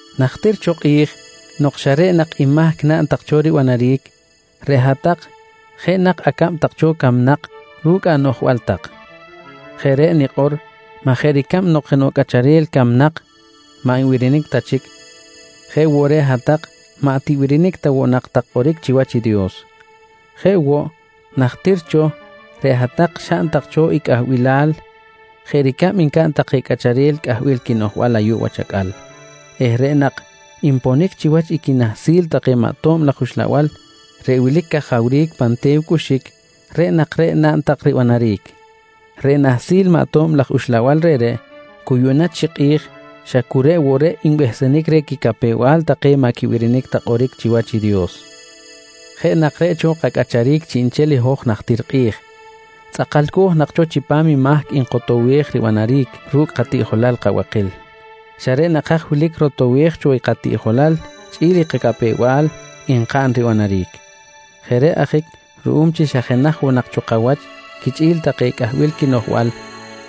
Najtir cho kꞌi̱j nok xa reꞌ nak i mahc naꞌn tak cho ribanaric, reꞌ hat-tak jeꞌ nak acab tak cho camnak ru̱cꞌ anoꞌjbal tak. Jeꞌ reꞌ nikꞌor maj jeꞌ ricab nok jenoꞌ cꞌacharel camnak maꞌ nbirinic ta chic, jeꞌ woꞌ reꞌ hat-tak maꞌ tibirinic ta woꞌ nak tak kꞌoric chiwach i Dios. Jeꞌ woꞌ, najtir cho reꞌ hat-tak xaꞌn tak cho i cꞌahbilal jeꞌ ricab ncaꞌn take cꞌacharel cꞌahbil quinoꞌjbal ayuꞌ wach acꞌal eh reꞌ nak nponic chiwach i quinahsil take maꞌ tob laj uxlabal reꞌ wilic cajawric pan te̱w cꞌuxic, reꞌ nak reꞌ naꞌn tak ribanaric. Reꞌ nahsil maꞌ to̱b laj uxlabal reꞌreꞌ, cu yuꞌna chi kꞌi̱j xa cu reꞌ woꞌ reꞌ nbehsenic reh quicapew-bal take maꞌ quibirinic ta kꞌoric chiwach i Dios. Jeꞌ nak reꞌ cho kacꞌacharic chiꞌnchel i hoj najtir kꞌi̱j, tzꞌakalco̱j nak cho chipam i mahc nkotowej ribanaric ru̱cꞌ katiꞌjolal kabakil, xa reꞌ nak haj wilic rotowej cho i katiꞌjolal chꞌi̱l kacapew-bal nkaꞌn ribanaric. Jeꞌ reꞌ ajic ruꞌum chi xa jenaj woꞌ nak kawach quichꞌi̱l take cꞌahbil quinoꞌjbal,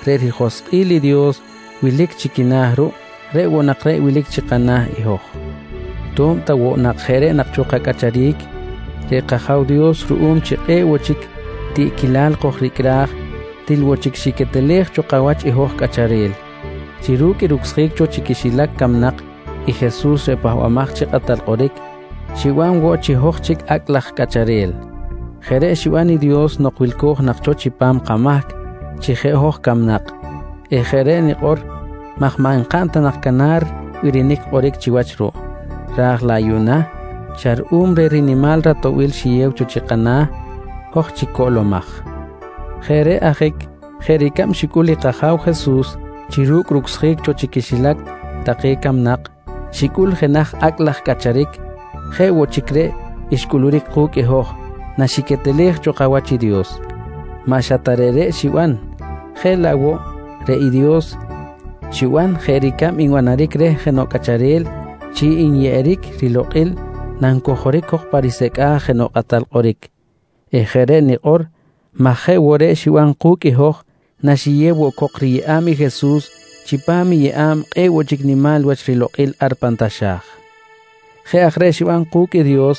reꞌ rijoskꞌil i Dios wilic chi quina̱ ruꞌ, reꞌ woꞌ nak reꞌ wilic chi kana̱ i hoj. To̱b ta woꞌ jeꞌ nak reꞌ cho kacꞌacharic, reꞌ kAja̱w Dios ruꞌum chi kꞌe̱ꞌ woꞌ chic tiꞌquilal kojricꞌraj til woꞌ chic xiquetelej cho kawach i hoj cꞌacharel chi ru̱cꞌ i rucsjic cho chi quixilac camnak i Jesus reꞌ Pahbamaj chi Kꞌatal Kꞌoric, xiban woꞌ chi hoj chic acꞌ laj cꞌacharel. Jeꞌ reꞌ xiban i Dios nok wilco̱j nak cho chipam kamahc chi jeꞌ hoj camnak eh jeꞌ reꞌ nikꞌor maj maꞌ nkaꞌn ta nak canar birinic kꞌoric chiwach ruꞌ. Ra̱j laꞌ yuꞌna xa ruꞌum reh rinimal ratoꞌbil xiyew cho chi kana̱, hoj chic coꞌlomaj. Jeꞌ reꞌ ajic jeꞌ ricab xicꞌul i kAja̱w Jesus chi ru̱cꞌ rucsjic cho chi quixilac take camnak xicꞌul jenaj acꞌ laꞌ cꞌacharic, jeꞌ woꞌ chic reꞌ xcꞌuluric ku̱cꞌ i hoj naxiquetelej cho kawach i Dios. Maꞌ xa ta reꞌreꞌ xiban jeꞌ laꞌ woꞌ reꞌ i Dios xiban jeꞌ ricab nbanaric reh jenoꞌ cꞌacharel chi nyeꞌeric rilokꞌil nancojoric cok pa risecꞌa̱j jenoꞌ kꞌatal kꞌoric eh jeꞌ reꞌ nikꞌor maj jeꞌ woꞌ reꞌ xiban ku̱cꞌ i hoj naxiyew woꞌ cok riyeꞌa̱b i Jesus chipam i yeꞌa̱b kꞌe̱ꞌ woꞌ chic nimal wach rilokꞌil ar pan taxa̱j. Jeꞌ aj reꞌ xiban ku̱cꞌ i Dios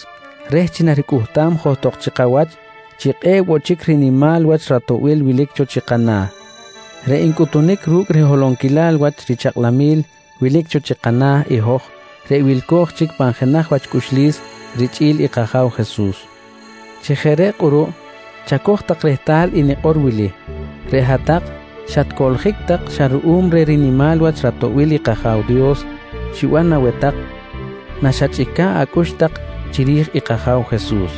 reh chi naricꞌuhtam johtok chi kawach chi kꞌe̱ꞌ woꞌ chic rinimal wach ratoꞌbil wilic cho chi kana̱ reꞌ ncꞌutunic ru̱cꞌ riholonquilal wach richakꞌlamil wilic cho chi kana̱ i hoj reꞌ wilco̱j chic pan jenaj wach cꞌuxlis richꞌi̱l i kAja̱w Jesus. Chi jeꞌ reꞌ kꞌuruꞌ chacoj tak rehtal i nikꞌor wili: Reꞌ hat-tak xatcoꞌljic tak xa ruꞌum reh rinimal wach ratoꞌbil i kAja̱w Dios xiban aweh tak naxachꞌica̱ꞌ acꞌux tak chiri̱j i kAja̱w Jesus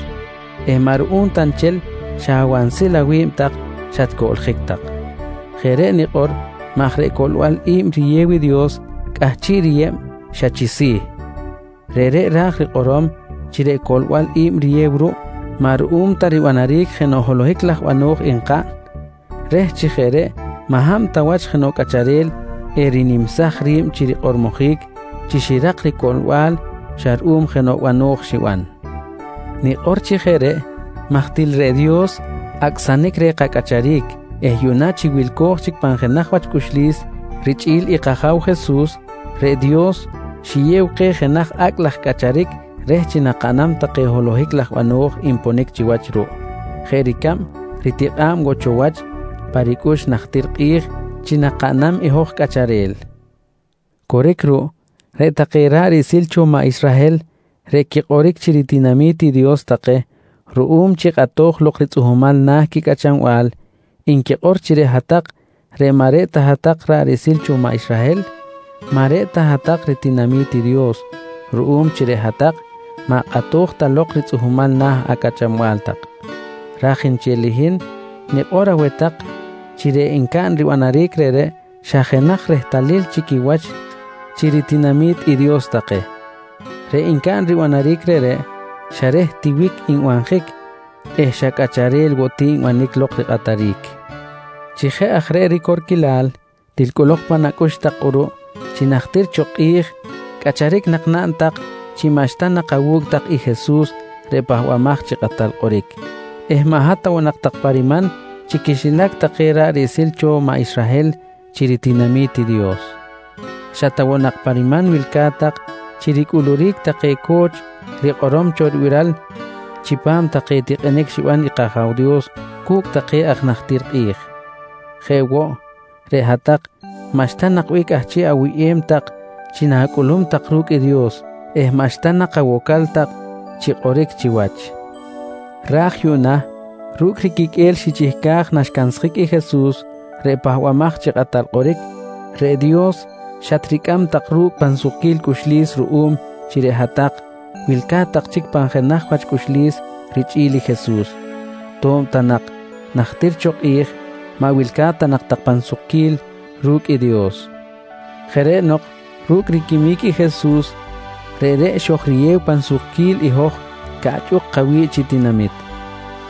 eh maꞌ ruꞌum ta nchel xa awansil awi̱b tak xatcoꞌljic tak. Jeꞌ reꞌ nikꞌor maj reꞌ coꞌlbal i̱b riyew i Dios cꞌahchiꞌ riyeb xa chi si̱. Reꞌreꞌ ra̱j rikꞌorom chi reꞌ coꞌlbal i̱b riyew ruꞌ, maꞌ ruꞌum ta ribanaric jenoꞌ holohic laj bano̱j nkaꞌn, reh chi jeꞌ reꞌ maꞌ hab ta wach jenoꞌ cꞌacharel erinimsaj ri̱b chi rikꞌormojic chi xirak ricoꞌlbal xa ruꞌum jenoꞌ bano̱j xiban. Nikꞌor chi jeꞌ reꞌ maj til reꞌ Dios acꞌsanic reh kacꞌacharic eh yuꞌna chi wilco̱j chic pan jenaj wach cꞌuxlis richꞌi̱l i kAja̱w Jesus, reꞌ Dios xiyew keh jenaj acꞌ laj cꞌacharic reh chi nakaꞌnam take holohic laj bano̱j nponic chiwach ruꞌ jeꞌ ricab ritikꞌa̱b woꞌ cho wach pa ricꞌux najtir kꞌi̱j chi nakaꞌnam i hoj cꞌacharel. Coric ruꞌ, reꞌ take ra̱ꞌ riꞌsil cho maꞌ Israhel reꞌ quikꞌoric chi ritinami̱t i Dios take ruꞌum chi kꞌato̱j lok ritzꞌuhmal na̱ quicꞌachanbal nquikꞌor chi reꞌ hat-tak reꞌ maꞌ reꞌ ta hat-tak ra̱ꞌ riꞌsil cho maꞌ Israhel, maꞌ reꞌ ta hat-tak ritinami̱t i Dios ruꞌum chi reꞌ hat-tak maꞌ kꞌato̱j ta lok ritzꞌuhmal na̱ acꞌachanbal tak. Raj nchel i hin nikꞌor aweh tak chi reꞌ ncaꞌn ribanaric reꞌreꞌ xa jenaj rehtalil chi quiwach chi ritinami̱t i Dios take. Reꞌ ncaꞌn ribanaric reꞌreꞌ, xa reh tiwic nbanjic eh xa cꞌacharel woꞌ ti nbanic lok rikꞌataric. Chi jeꞌ aj reꞌ ricorquilal, til cꞌolok pan acꞌux tak kꞌuruꞌ chi najtir cho kꞌi̱j cꞌacharic nak naꞌn tak chi maꞌxta nak awu̱cꞌ tak i Jesus reꞌ Pahbamaj chi Kꞌatal Kꞌoric eh maꞌ hat ta woꞌ nak tak pa riman chi quixilac take ra̱ꞌ riꞌsil cho maꞌ Israhel chi ritinami̱t i Dios. Xa ta woꞌ nak pa riman wilca̱t tak chi ricꞌuluric take co̱ch rikꞌorom cho ribiral chipam take tikꞌinic xiban i kAja̱w Dios cu̱cꞌ take aj najtir kꞌi̱j. Jeꞌ woꞌ, reꞌ hat-tak maꞌxta nak bih cꞌahchiꞌ awuyꞌem tak chi na̱cꞌulum tak ru̱cꞌ i Dios eh maꞌxta nak awocal tak chi kꞌoric chiwach. Raj yuꞌna ru̱cꞌ riquiqꞌue̱l xichihcaj naxcansjic i Jesus reꞌ Pahbamaj chi Kꞌatal Kꞌoric, reꞌ Dios xatricꞌam tak ru̱cꞌ pan sukquil cꞌuxlis ruꞌum chi reꞌ hat-tak wilca̱t tak chic pan jenaj wach cꞌuxlis richꞌi̱l i Jesus to̱b ta nak najtir cho kꞌi̱j maꞌ wilca̱t ta nak tak pan sukquil ru̱cꞌ i Dios. Jeꞌ reꞌ nok ru̱cꞌ riquimic i Jesus, reꞌreꞌ xojriyew pan sukquil i hoj caꞌchꞌuk kawi̱ꞌ chi tinamit.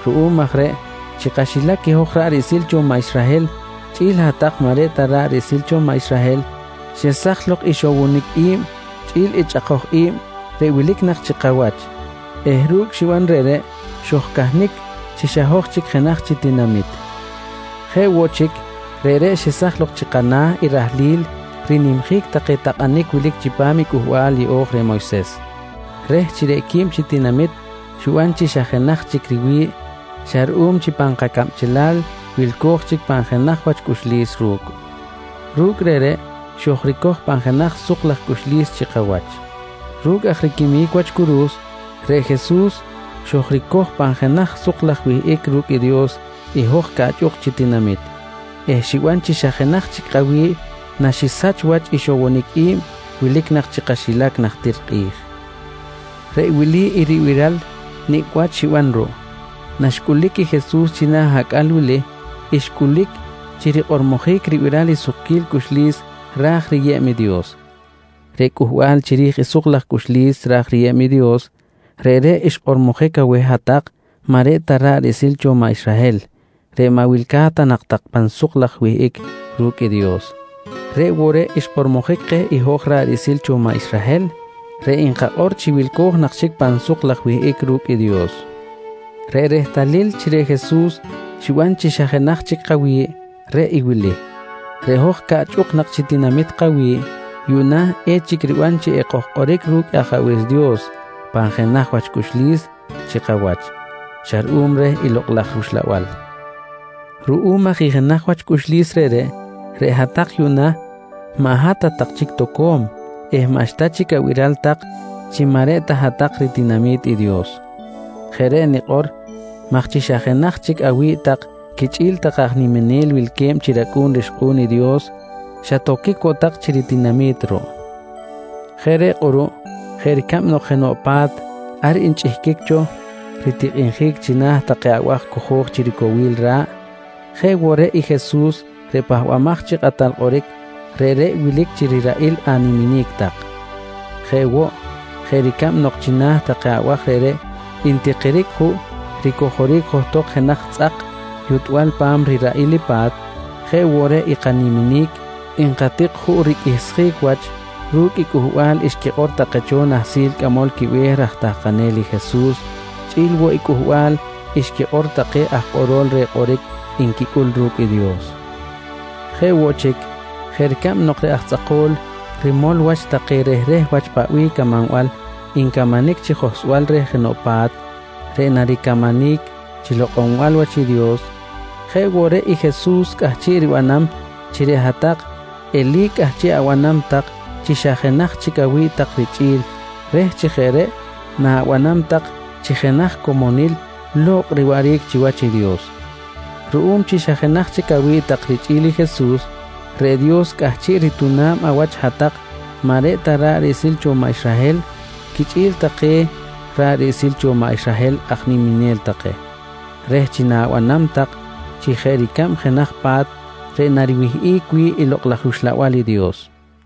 Ruꞌum aj reꞌ chi kaxilac i hoj ra̱ꞌ riꞌsil cho maꞌ Israhel chꞌi̱l hat-tak maꞌ reꞌ ta hat-tak ra̱ꞌ riꞌsil cho maꞌ Israhel, xesaj lok i ixowonic i̱b chꞌi̱l i chꞌakoj i̱b reꞌ wilic nak chi kawach eh ru̱cꞌ xiban reꞌreꞌ, xojcahnic chi xa hoj chic jenaj chi tinamit. Jeꞌ woꞌ chic, reꞌreꞌ xesaj chi kana̱ i rahlil rinimjic take takꞌanic wilic chipam i Cꞌuhbal Yeꞌo̱j reh Moyses, reh chi reꞌ quib chi tinamit xiban chi xa jenaj chic riwi̱ꞌ xa ruꞌum chi pan kacabchelal wilco̱j chic pan jenaj wach cꞌuxlis ru̱cꞌ. Ru̱cꞌ reꞌreꞌ xojricoj pan jenaj suk laj cꞌuxlis chi kawach. Ru̱cꞌ aj riquimic wach curu̱s, reꞌ Jesus xojricoj pan jenaj suk laj wihꞌic ru̱cꞌ i Dios i hoj caꞌchꞌuk chi tinamit eh xiban chi xa jenaj chic kawi̱ꞌ naxisach wach i ixowonic i̱b wilic nak chi kaxilac najtir kꞌi̱j. Reꞌ wili i ribiral nicꞌ wach xiban ruꞌ: Naxcꞌulic i Jesus china̱ acꞌal wili, xcꞌulic chi rikꞌormojic ribiral i sukquil cꞌuxlis ra̱j riyeb i Dios. Reꞌ cꞌuhbal chiri̱j i suk laj cꞌuxlis ra̱j riyeb i Dios reꞌreꞌ xkꞌormojic aweh hat-tak maꞌ reꞌ ta hat-tak ra̱ꞌ riꞌsil cho maꞌ Israhel reꞌ maꞌ wilca̱t ta tak pan suk laj wihꞌic ru̱cꞌ i Dios. Reꞌ woꞌ reꞌ xkꞌormojic keh i hoj ra̱ꞌ riꞌsil cho maꞌ Israhel reꞌ nkakꞌor chi wilco̱j nak chic pan suk laj wihꞌic ru̱cꞌ i Dios. Reꞌ rehtalil chi reꞌ Jesus xiban chi xa jenaj chic kawi̱ꞌ, reꞌ i wili: Reꞌ hoj caꞌchꞌuk nak chi tinamit kawi̱ꞌ, yuꞌna echic riban chi ekojkꞌoric ru̱cꞌ Ajabe̱s Dios pan jenaj wach cꞌuxlis chi kawach xa ruꞌum reh i Lokꞌ laj rUxlabal. Ruꞌum aj i jenaj wach cꞌuxlis reꞌreꞌ, reꞌ hat-tak yuꞌna maꞌ hat ta tak chic toco̱m eh maꞌxta chic abiral tak chi maꞌ reꞌ ta hat-tak ritinami̱t i Dios. Jeꞌ reꞌ nikꞌor maj chi xa jenaj chic awi̱ꞌ tak quichꞌi̱l take aj niminel wilque̱b chi racꞌu̱n rixkꞌu̱n i Dios, xatoquic woꞌ tak chi ritinami̱t ruꞌ. Jeꞌ reꞌ kꞌuruꞌ jeꞌ ricab nok jenoꞌ pa̱t ar nchꞌihquic cho ritikꞌinjic china̱ take abaj cojo̱j chi ricowil ra̱ꞌ, jeꞌ woꞌ reꞌ i Jesus reꞌ Pahbamaj chi Kꞌatal Kꞌoric, reꞌreꞌ wilic chi riraꞌil animinic tak. Jeꞌ woꞌ, jeꞌ ricab nok china̱ take abaj reꞌreꞌ ntikiric juꞌ ricojoric johtok jenaj tzꞌak yutbal pa̱m riraꞌil i pa̱t jeꞌ woꞌ reꞌ i kaniminic nkatik juꞌ riqꞌuihsjic wach ru̱cꞌ i cꞌuhbal xquikꞌor take cho nahsil cꞌamol quibe̱h raj tahkanel i Jesus chꞌi̱l woꞌ i cꞌuhbal xquikꞌor take aj kꞌorol reh kꞌoric nquicꞌul ru̱cꞌ i Dios. Jeꞌ woꞌ chic, jeꞌ ricab nok reꞌ aj tzꞌako̱l rimol wach take rehreh wach paꞌ bih camanbal ncamanic chi johsbal reh jenoꞌ pa̱t reꞌ naricamanic chi lokꞌonbal wach i Dios, jeꞌ woꞌ reꞌ i Jesus cꞌahchiꞌ ribanam chi reꞌ hat-tak eli̱c cꞌahchiꞌ abanam tak chi xa jenaj chic awi̱b tak richꞌi̱l reh chi jeꞌ reꞌ na̱banam tak chi jenaj comonil lo̱kꞌ riwaꞌric chiwach i Dios. Ruꞌum chi xa jenaj chic awi̱ꞌ tak richꞌi̱l i Jesus, reꞌ Dios cꞌahchiꞌ rituna̱b awach hat-tak maꞌ reꞌ ta ra̱ꞌ riꞌsil cho maꞌ Israhel quichꞌi̱l take ra̱ꞌ riꞌsil cho maꞌ Israhel aj niminel take, reh chi na̱banam tak chi jeꞌ ricab jenaj pa̱t reꞌ nariwihꞌic wi̱ꞌ i Lokꞌ laj rUxlabal i Dios.